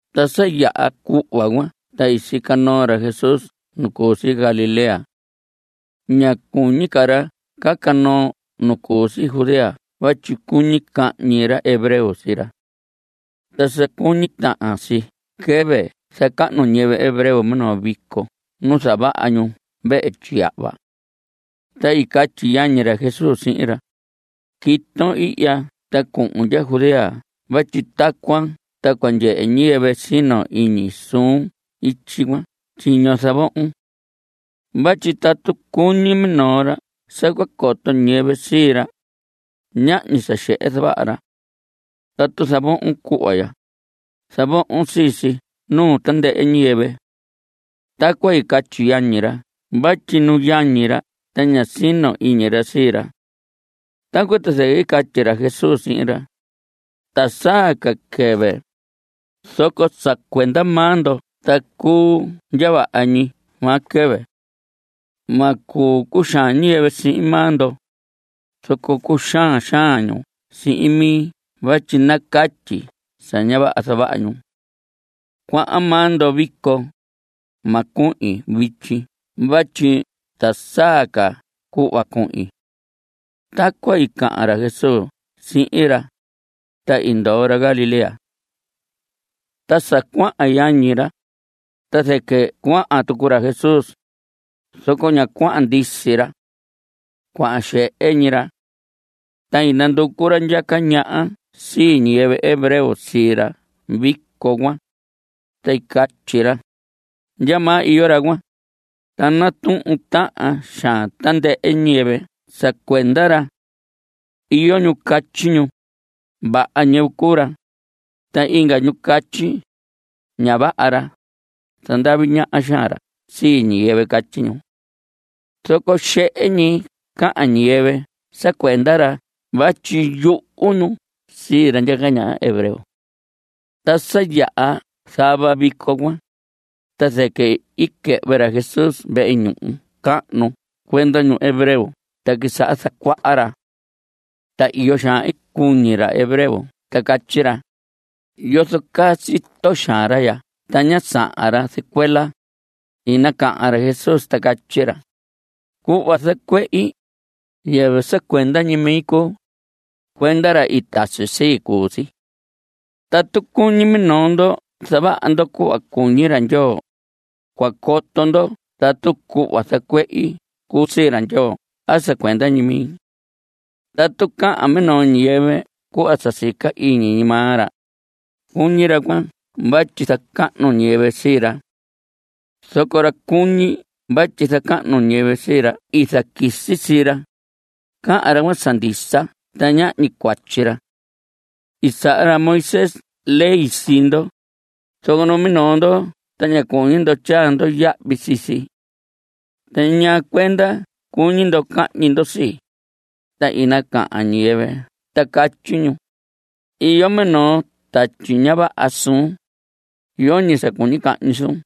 Ta sa yaha cuhva cuan ta i sica noo ra Jesús nu cu si Galilea. Ña cuñi ca ra caca noo nu cu si Judea vatyi cuñi cahñi ra hebreo sii ra. Ta sa cuñi tahan si quɨvɨ zacahnu ñiyɨvɨ hebreo minoo vico nu zavaha ñu vehe tyiyahva. Ta i catyi yañi ra Jesús sihin ra: Quiton ihya ta cuhun ndya Judea vatyi tacuan ta cua ndyehe ñiyɨvɨ sino iñi suun ityi cuan tyiño zavohon. Vatyi tatu cuñi minoo ra sa cua coto ñiyɨvɨ sii ra, ñahñi sa xehe zavaha ra. Tatu zavohon cuhva ya, zavohon sii si nuu tandɨhɨ ñiyɨvɨ. Tacuan catyi yañi ra vatyi nu yañi ra ta ñá sino iñi ra sii ra. Tacuan ta zɨquɨ i catyi ra Jesús sihin ra: Ta saa ca quɨvi, zoco sa cuenda maa ndo ta cuu ndya vaha ñi maa quɨvɨ. Ma cuu cuxaan ñiyɨvɨ sihin maa ndo, zoco cuxaan xaan ñu sihin mi vatyi nacatyi sa ña vaha sa zavaha ñu. Cuahan maa ndo vico. Ma cuhin vityi vatyi ta saa ca cuhva cuhin. Tacuan i cahan ra Jesús sihin ra, ta i ndoo ra Galilea. Ta sa cuahan yañi ra, ta zɨquɨ cuahan tucu ra Jesús, zoco ña cuahan ndisi ra. Cuahan xehe ñi ra. Ta i nanducu ra ndyaca ñaha sii ñiyɨvɨ hebreo sii ra vico cuan, ta catyi ra: ¿Ndyamaa iyo ra cuan? Ta natuhun tahan xaan tandɨhɨ ñiyɨvɨ sa cuenda ra. Iyo ñu catyi ñu: “Vaha ñiyɨvɨ cuu ra.” Ta inga ñu catyi: “Ña vaha ra. Zandavi ñaha xaan ra sii ñiyɨvɨ.” Catyi ñu. Zoco xehe ñi cahan ñiyɨvɨ sa cuenda ra vatyi yuhu ñu sii ra ndyaca ñaha hebreo. Ta sa yaha zava vico cuan, ta zɨquɨ i quɨhvɨ ra Jesús vehe ñuhu cahnu cuenda ñu hebreo ta quisaha zacuaha ra. Ta iyo xaan i cuñi ra hebreo ta catyi ra: ¿Yozo caa sito xaan ra ya ta ñá sahan ra zɨcuela? I nacahan ra Jesús ta catyi ra: Cuhva zacuehi, yɨvɨ sa cuenda ñi mi cuu. Cuenda ra i tasi sii cuu si. Tatu cuñi minoo ndo zavaha ndo cuhva cuñi ra Ndyoo, cua coto ndo tatu cuhva zacuehi cuu sii ra Ndyoo a sa cuenda ñi mi. Tatu cahan minoo ñiyɨvɨ cuhva sa sica ñi iñi maa ra, cuñi ra cuan vatyi zacahnu ñiyɨvɨ sii ra. Zoco ra cuñi vatyi zacahnu ñiyɨvɨ sii ra i zaquisi sii ra, cahan ra cuan sa ndisa ta ñahñi cuatyi ra. I saha ra Moisés ley sii ndo, zoco numinoo ndo ta ña cuñi ndo tyaa ndo yahvi sii si. ¿Ta ñaa cuenda cuñi ndo cahñi ndo sii? Ta i nacahan ñiyɨvɨ ta catyi ñu: Iyo minoo tatyi ña vaha suun. Yoñi sa cuñi cahñi suun.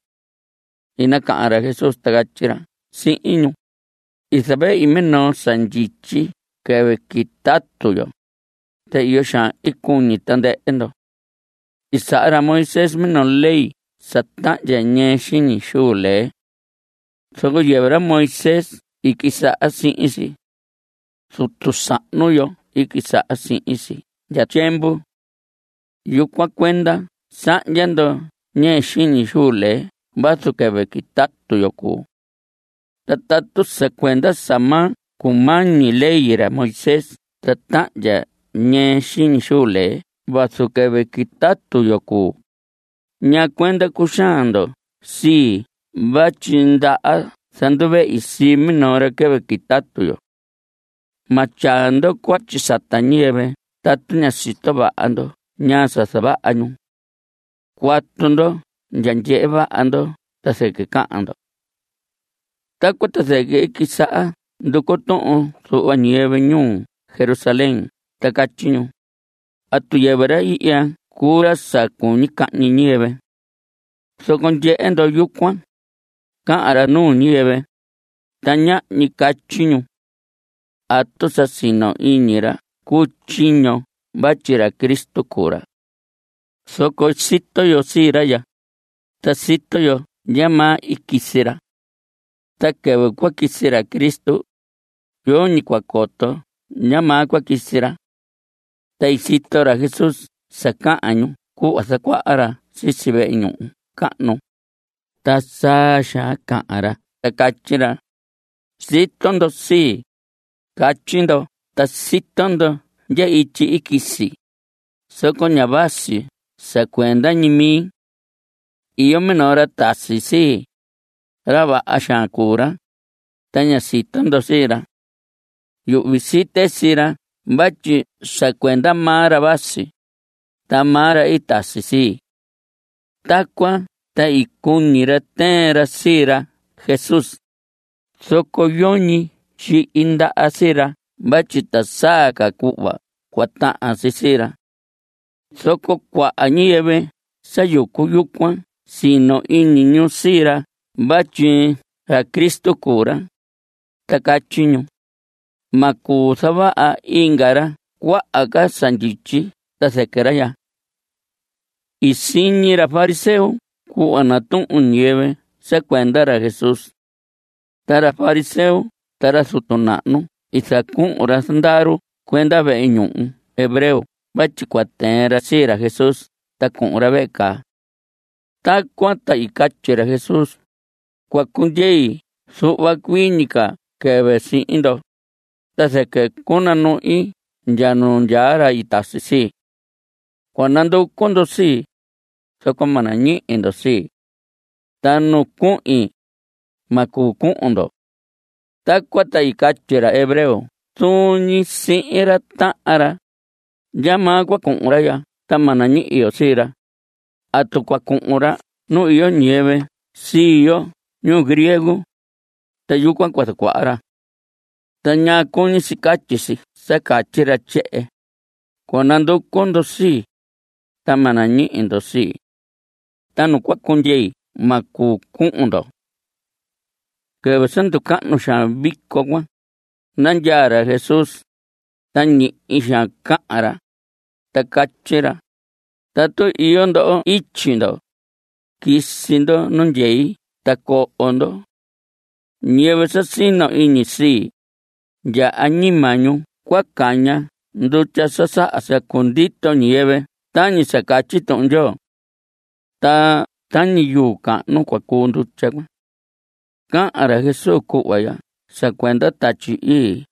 I nacahan ra Jesús ta catyi ra sihin ñu: I zavehi minoo sa ndyityi quɨvɨ quitatu yo, ta iyo xaan cuñi tandɨhɨ ndo. I saha ra Moisés minoo ley sa tahndya ñɨɨ xiñi xuu lee. Zoco yɨvɨ ra Moisés i quisaha sihin si. Zutu sahnu yo i quisaha sihin si ndya tyiemvu. Yucuan cuenda sahndya ndo ñɨɨ xiñi xuu lee vazu quɨvɨ quitatu yo cuu. Ta tatu sa cuenda sa ma cumañi ley ra Moisés ta tahndya ñɨɨ xiñi xuu lee vazu quɨvɨ quitatu yo cuu, ¿ñaa cuenda cuxaan ndo sii vatyi ndaha zanduvehi sii minoo ra quɨvɨ quitatu yo? Ma tyaa ndo cuatyi sata ñiyɨvɨ tatu ña sito vaha ndo ñaa sa zavaha ñu. Cuatu ndo ndya ndyehe vaha ndo ta zɨquɨ cahan ndo. Tacuan ta zɨquɨ i quisaha nducu tuhun zuhva ñiyɨvɨ ñuu Jerusalén ta catyi ñu: ¿Atu yɨvɨ ra ihya cuu ra sa cuñi cahñi ñiyɨvɨ? Zoco ndyehe ndo yucuan, cahan ra nuu ñiyɨvɨ, ta ñahñi catyi ñu. ¿Atu sa sino iñi ra cu tyiño vatyi ra Cristo cuu ra? Zoco sito yo sii ra ya, ta sito yo ndyamaa i quisi ra. Ta quɨvɨ cua quisi ra Cristo, yoñi cua coto ndyamaa cua quisi ra. Ta sito ra Jesús sa cahan ñu cuhva zacuaha ra sisi vehe ñuhu cahnu, ta saa xaan cahan ra ta catyi ra: Sito ndo sii, catyi ndo ta sito ndo ndya ityi i quisi, zoco ña vasi sa cuenda ñi mi. Iyo minoo ra tasi sii. Ra vaha xaan cuu ra, ta ña sito ndo sii ra. Yuhvi site sii ra vatyi sa cuenda maa ra vasi, ta maa ra i tasi sii. Tacuan ta i cuñi ra tɨɨn ra sii ra Jesús, zoco yoñi tyihi ndaha sii ra vatyi ta saa ca cuhva cua tahan si sii ra. Zoco cuaha ñiyɨvɨ sa yucu yucuan sino iñi ñu sii ra vatyi ra Cristo cuu ra, ta catyi ñu: Ma cuu zavaha inga ra cuaha ca sa ndyityi ta zɨquɨ ra ya. I siñi ra fariseo cuhva natuhun ñiyɨvɨ sa cuenda ra Jesús. Ta ra fariseo ta ra zutu nahnu i zacuhun ra zandaru cuenda vehe ñuhu hebreo vatyi cua tɨɨn ra sii ra Jesús ta cuhun ra vehe caa. Tacuan ta i catyi ra Jesús: Cua cundyei zuhva cuii ñi ca quɨvɨ sihin ndo, ta zɨquɨ cunanuhin ndya nu ndyaa ra i tasi sii. Cua nanducu ndo sii, zoco ma nañihi ndo sii. Ta nu cuhin, ma cuu cuhun ndo. Tacuan ta i catyi ra hebreo zuun ñi sihin ra tahan ra: ¿Ndyamaa cua cuhun ra ya ta ma nañihi yo sii ra? ¿Atu cua cuhun ra nu iyo ñiyɨvɨ sii yo ñuu griego, ta yucuan cua zacuaha ra? ¿Ta ñaa cuñi si catyi si sa catyi ra tyehen: “Cua nanducu ndo sii, ta ma nañihi ndo sii. Ta nu cua cundyei ma cuu cuhun ndo”? Quɨvɨ sa nducahnu xaan vico cuan, nandyaa ra Jesús, ta ñihi xaan cahan ra, ta catyi ra: Tatu iyo ndo ityi ndo, quisi ndo nu ndyei ta coho ndo. Ñiyɨvɨ sa sino iñi sii, ndya añima ñu cua caña ndutya sa saha sa cundito ñiyɨvɨ tañi sa catyi Tuhun Ndyoo. Ta tañi yuu cahnu cua cuu ndutya cuan. Cahan ra Jesús cuhva ya sa cuenda Tatyi Ii.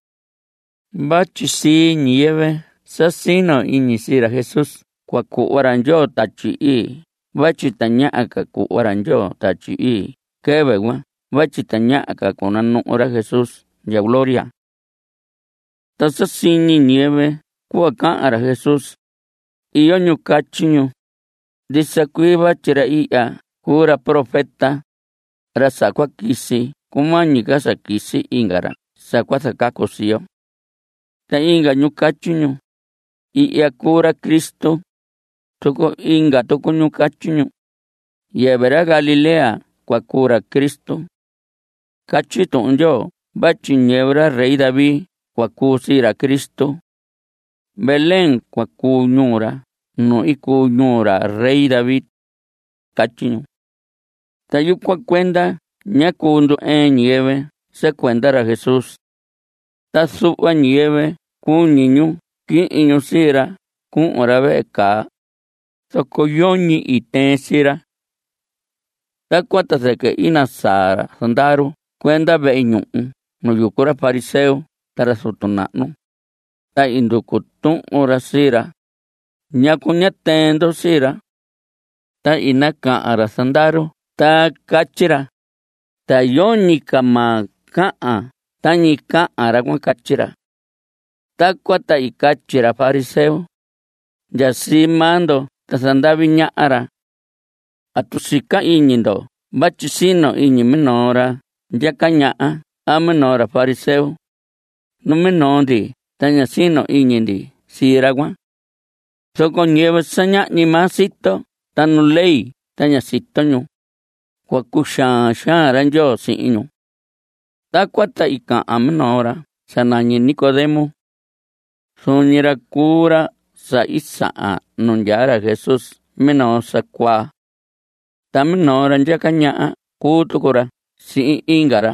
Vatyi sii ñiyɨvɨ sa sino iñi sii ra Jesús cua cuhva ra Ndyoo Tatyi Ii vatyi tañaha ca cuhva ra Ndyoo Tatyi Ii quɨvɨ cuan vatyi tañaha ca cunanuhu ra Jesús ndya gloria. Ta sa siñi ñiyɨvɨ cuhva cahan ra Jesús, iyo ñu catyi ñu: Ndisa cuii vatyi ra ihya cuu ra profeta, ra sa cua quisi cumañi ca sa quisi inga ra sa cua zacacu sii yo. Ta inga ñu catyi ñu: Ihya cuu ra Cristo. Zoco inga tucu ñu catyi ñu: Yɨvɨ ra Galilea cua cuu ra Cristo. Catyi Tuhun Ndyoo vatyi ñiyɨvɨ ra rey David cua cuu sii ra Cristo. Belén cua cuu ñuu ra nu i cuu ñuu ra rey David. Catyi ñu. Ta yucuan cuenda ñá cuu ndu‑ɨɨn ñiyɨvɨ sa cuenda ra Jesús. Ta zuhva ñiyɨvɨ cuñi ñu quihin ñu sii ra cuhun ra vehe caa, zoco yoñi i tɨɨn sii ra. Tacuan ta zɨquɨ i nasaa ra zandaru cuenda vehe ñuhu nu yucu ra fariseo ta ra zutu nahnu, ta i nducu tuhun ra sii ra: ¿Ñacu ñá tɨɨn ndo sii ra? Ta i nacahan ra zandaru ta catyi ra: Ta yoñi ca maa cahan tañi cahan ra cuan. Catyi ra. Tacuan ta i catyi ra fariseo: Ndya sii maa ndo ta zandavi ñaha ra. ¿Atu sica iñi ndo vatyi sino iñi minoo ra ndyaca ñaha a minoo ra fariseo? Numinoo ndi ta ña sino iñi ndi sii ra cuan. Zoco ñiyɨvɨ sa ñahñi maa sito ta nu ley ta ña sito ñu, cua cuxaan xaan ra Ndyoo sihin ñu. Tacuan ta i cahan minoo ra sa nañi Nicodemo. Zuun ñi ra cuu ra sa i sahan nu ndyaa ra Jesús minoo sa cuaa. Ta minoo ra ndyaca ñaha cuu tucu ra sihin inga ra,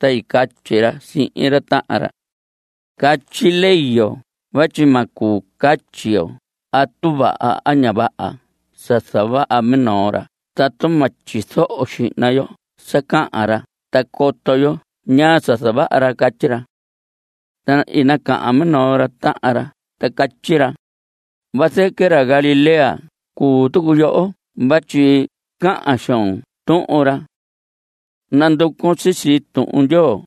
ta i catyi ra sihin ra tahan ra: Catyi ley yo vatyi ma cuu catyi yo atu vaha a ña vaha sa zavaha minoo ra tatu ma tyizoho xihna yo sa cahan ra ta coto yo ñaa sa zavaha ra. Catyi ra. Ta i nacahan minoo ra tahan ra ta catyi ra: Vazɨquɨ ra Galilea cuu tucu yoho vatyi cahan xoon tuhun ra. Nanducun sisi Tuhun Ndyoo,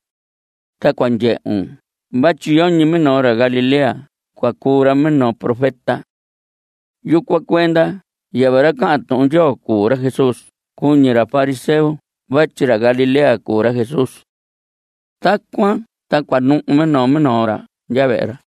ta cua ndyehun vatyi yoñi minoo ra Galilea cua cuu ra minoo profeta. (Yucuan cuenda yɨvɨ ra cahan Tuhun Ndyoo cuu ra Jesús cuñi ra fariseo vatyi ra Galilea cuu ra Jesús.) Tacuan ta cuanuhu minoo minoo ra ndya vehe ra.